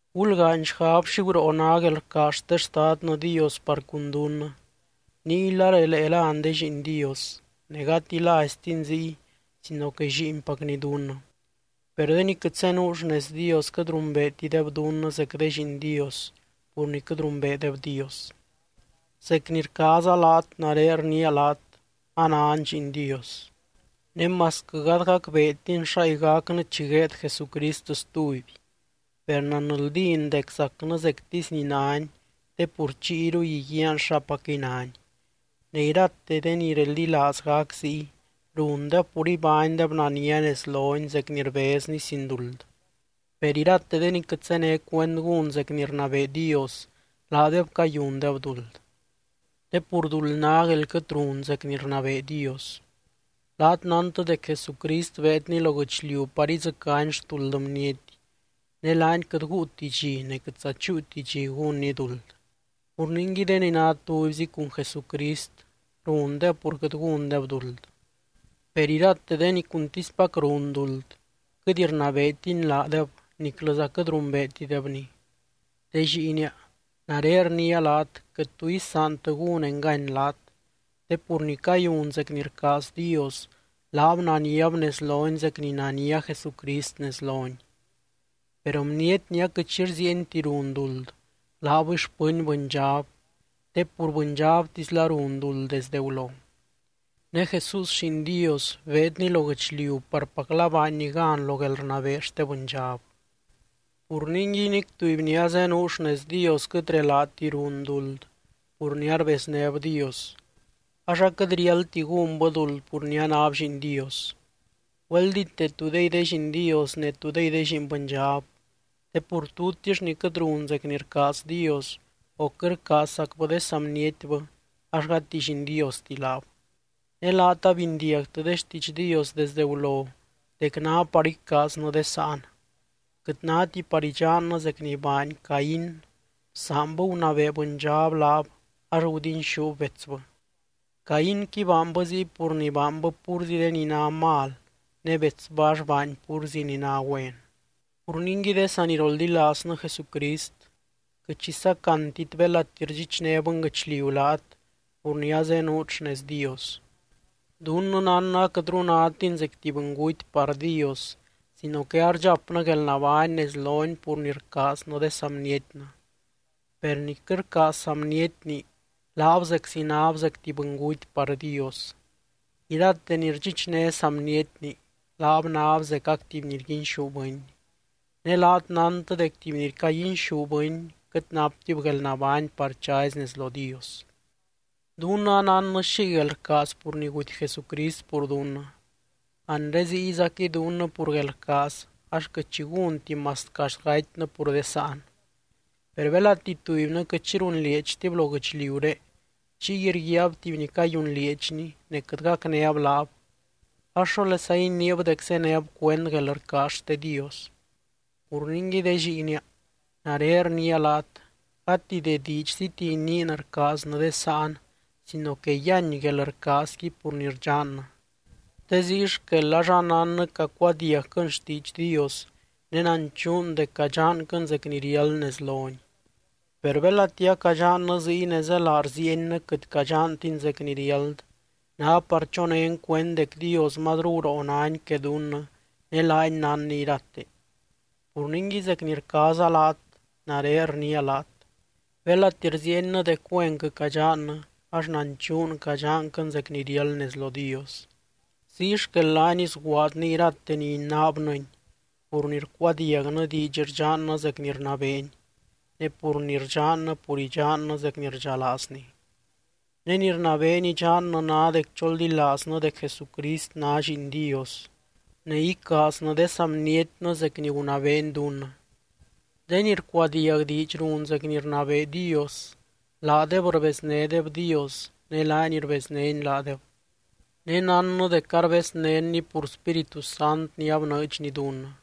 Gulgaany xgab xi guroo ná guelrcaaz xte Xtadnɨ Dios par cun dunnɨ. Niyla relee lán de lliin Dios. Ne gati láiztin ziy sino que lliinpacny dunnɨ. Per de ni quɨt zenuu xnez Dios, quɨt rumbeetideb dunnɨ zec de lliin Dios pur ni quɨt rumbeedeb Dios. Zec ni rcaaza laat, nare rniia laat: anan lliin Dios. Ne masquɨ gady gacbeetin xáy gacnɨ chi gueed Jesucrist stuby, per nanldín dec zacnɨ zectisy ni nány te pur chiyruy iguiaan xapacquɨy nány. Ne irate de ni reldilaaz gac ziy, rundeb pur ibánydeb nania nez lony zec ni rbezny sin duld. Per irate de ni quɨt zéne cuend gún zec ni rnabee Dios, laadeb cayundeb duld. Te pur duld ná guél quɨt run zec ni rnabee Dios. Laat nántɨ dec Jesucrist beedny lo guɨchliu par idzɨcány xtuld bniety, ne laany quɨt guuti dxi ne quɨtza chúuti dxi gúnny duld. Pur ningui, de ni ná tubyzi cun Jesucrist rundeb pur quɨt gúndeb duld. Per irate de ni cuntispac run duld, quɨt rnabeetiny laadeb niclɨza quɨt rumbeetidebny. De lliinia, nare rniia laat quɨt tu isaantɨ gún engany laat, te pur ni cayun zec ni rcaaz Dios, laab naniab nez lony zec ni nania Jesucrist nez lony. Per bniety ni aquɨt xi rziienti run duld, laabɨy xpɨny bɨndxab te pur bɨndxabtizla run duld desdɨ gulo. Ne Jesús Lliin Dios beedny lo guɨchliu parpacla baanny gan lo guelrnabee xte bɨndxab. Pur ningui, nic tuby ni azenuu xnez Dios quɨt relaati run duld pur ni arbeznéb Dios, ax aquɨt riáldti gúnbɨ duld pur ni anáb lliin Dios. Güeldíte tudey de lliin Dios ne tudey de lliin bɨndxab, te pur tutix ni quɨt run zec ni rcaaz Dios o quɨt rcaazzacbɨ de saa bnietbɨ ax gati lliin Diosti laab. Ne laat abindiagtɨ de xtiidx Dios desde gulo dec ná par icaaznɨ de sáan. Quɨt náti par idxannɨ zec ni baany Caín: bsaanbɨ gunabee bɨndxab laab ax gudinxúb betsbɨ. Caínqui baanbɨ ziy pur ni baanbɨ púrzi de ni ná mal ne betsbɨ ax baany púrzi ni ná güen. Pur ningui de saniroldilaaznɨ Jesucrist, quɨt xi sacantit belati rdxichné bɨnguɨchliu laat pur ni azenuut xnez Dios. Dunnɨ nánnɨ aquɨtru nátin zec tuby bɨnguty par Dios sino que ardxapnɨ guelnabány nez lony pur ni rcaaznɨ de saa bnietnɨ. Per ni quɨt rcaaz saa bnietni, laab zeczi náb zec tuby bɨnguty par Dios. Irate ni rdxichné saa bnietni, laab náb zecac tuby ni rguinxú bɨny. Ne laat nántɨ dec tuby ni caguinxú bɨny quɨt naptib guelnabány par chazy nez lo Dios. Dunnɨ anánnɨ xiy guelrcaaz pur ni guty Jesucrist pur dunnɨ. Anre ziyzaquɨy dunnɨ pur guelrcaaz ax quɨt xi gúnti masquɨ axt gatynɨ pur de sáan. Per belati tubynɨ quɨt xi runlieedxtib lo guɨchliuré chiy rguiaab tuby ni cayunlieedxni ne quɨt gacnéb laab ax, ¿xólesa iniib dec zéneb cuend guelrcaaz xte Dios? Pur ningui de lliinia, nare rniia laat, gati de diidxziti iniin rcaaznɨ de sáan sino que yíany guelrcaazqui pur ni rdxannɨ. Te ziy xquel ax anánnɨ cacuadiagquɨn xtiidx Dios ne nanchuun dec cadxanquɨn zec ni riáld nez lony. Per belati acadxannɨ ziy ne zélaa rziiennɨ quɨt cadxantin zec ni riáld, ná par chonén cuend dec Dios mazru guroo nány que dunnɨ ne laany nánny irate. Pur ningui zec ni rcaaza laat, nare rniia laat: belati rziiennɨ dec güenquɨ cadxannɨ, ax nanchuun cadxanquɨn zec ni riáld nez lo Dios. Ziy xquel, laany sguaadny irate ni inaabnɨny pur ni rcuadiagnɨ diidx rdxannɨ zec ni rnabeeny, ne pur ni rdxannɨ pur idxannɨ zec ni rdxalaazny. Ne ni rnabeeny idxannɨ ná dec choldilaaznɨ dec Jesucrist ná Lliin Dios, ne icaaznɨ de saa bnietnɨ zec ni gunabeeny dunnɨ. De ni rcuadiag diidx run zec ni rnabee Dios, laadeb rbeznédeb Dios ne laany rbeznény laadeb. Ne nánnɨ dec arbeznénny pur Spíritu Sant ni abnɨɨdxny dunnɨ.